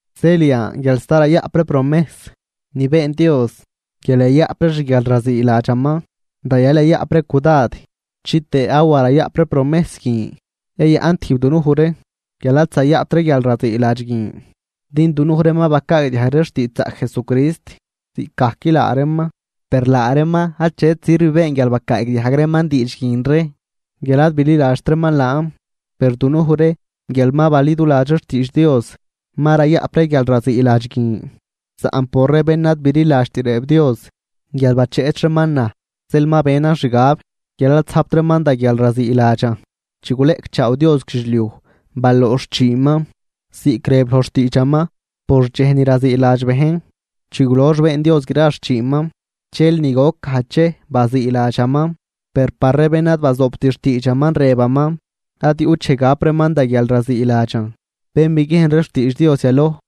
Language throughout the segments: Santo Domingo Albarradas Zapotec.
Zeel yan guial sta rayaꞌp ree promejs ni been Dios guial yayaꞌp ree xguialraziiladxaman, rayal yayaꞌp ree cudad chitëë awa rayaꞌp ree promejs guin yayaꞌn tijb dunuj ree guial ad zayaꞌpt ree guialraziiladx guin. Din dunuj ree ma bacaagdiajg ree xtiidxzaꞌc Jesucrist ziꞌcgajc laa reeman, per laa reeman achet sirv been guial bacaagdiajg reeman diidx guin ree, guial ad bililadxt reeman laan. Per dunuj ree guial ma baliduladx ree xtiidx Dios, ma rayaꞌp ree guialraziiladx guin, saꞌn por ree bén ad bililadxt rëb Dios: Guial bacheꞌch reeman naj zeel ma benan xgab guial ad zajpt reeman da guialraziiladxan. Diizd chi guleꞌcchaaw Dios guidxliuj baloox xchiinman, ziꞌc rëb loj xtiidxaman por dxej ni raziiladx bejn: Chi gulox been Dios gra xchiinman dxel ni goc gajdx dxej baziiladxaman. Per par ree bén ad bazoobt xtiidxaman rëbaman: Ad yuꞌt dxej gap reeman da guialraziiladxan. Bén biguiejn ree xtiidx Dios yaloj,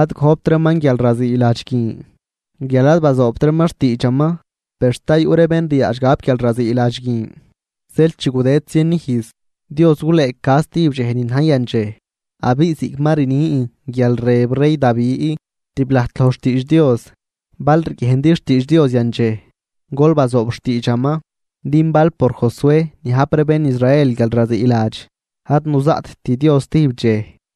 ad gojpt reeman guialraziiladx guin guial ad bazoobt reeman xtiidxaman, per sta yuꞌ ree bén ryaadx gap guialraziiladx guin. Zeel chi gudëd zien ijz, Dios gulëëca zatijb dxej ni na̱j yandxej. Abiꞌ ziꞌc ma rnin guial rëb rey Davi tib lajt loj xtiidx Dios: Bal riguiejndi xtiidx Dios yandxej, gol bazoob xtiidxaman. Din bal por Josué niajp ree bén Israel guialraziiladx, ad nuzaꞌtt Dios zatijb dxej.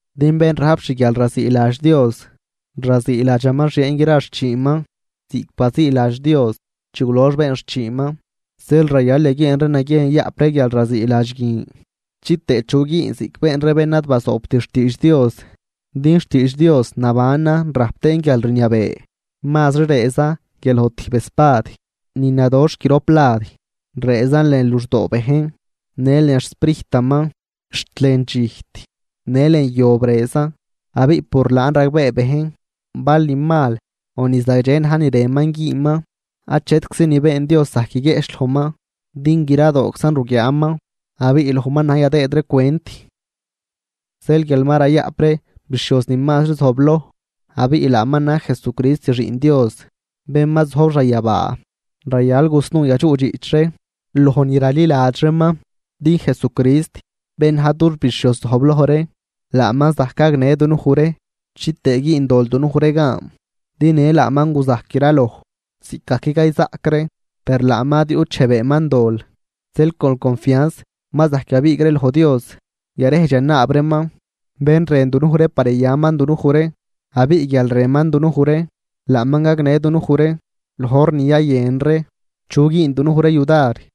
Din bén rajp xguialraziiladx Dios, raziiladxaman xieen gra xchiinman ziꞌc baziiladx Dios chi gulox been xchiinman. Zeel rayal yaguieen ree naguiejn yayaꞌp ree guialraziiladx guin, chitëë chu güün ziꞌc been ree bén ad bazoobt xtiidx Dios. Din xtiidx Dios nabanan rajp tëën guialrniabee. Mazri rëëzan guial loj tijb espad ni nadoxh grop lad, rëëzan lën luxdoo bejn në lën xsprijtaman. Xt lën dxijt në lën yob rëëzan, abiꞌ por laan ragbee bejn bal ni mal o ni zagdxe na̱j ni rënman güünman. Achetczi ni been Dios zajc guiguieꞌch lojman, din gradooczan ruguiaaman, abiꞌ lojman na̱j yadëëd ree cwent. Zeel guial ma rayaꞌp ree bixhioz ni mazri zojbloj, abiꞌ laaman na̱j Jesucrist Xiꞌn Dios, bén ma zojb xanyabaa, rayal yasnuu yadxuꞌdxiꞌch ree loj ni raliladx ree laaman. Din Jesucrist bén na̱j dux bixhioz zojbloj ree laaman zajc gagnë dunuj ree chitëë güün dol dunuj ree gan. Din në laaman guzajc graloj ziꞌcgajc cayzaꞌc ree, per laaman ad yuꞌt dxej beenman dol. Zeel con confianz ma zajc yabiig ree loj Dios yarejdx yanaab reeman, bén rën dunuj ree par yayaman dunuj ree. Abiꞌ guial rënman dunuj ree, laaman gagnë dunuj ree loj hor ni yayën ree chu güün dunuj ree yudar.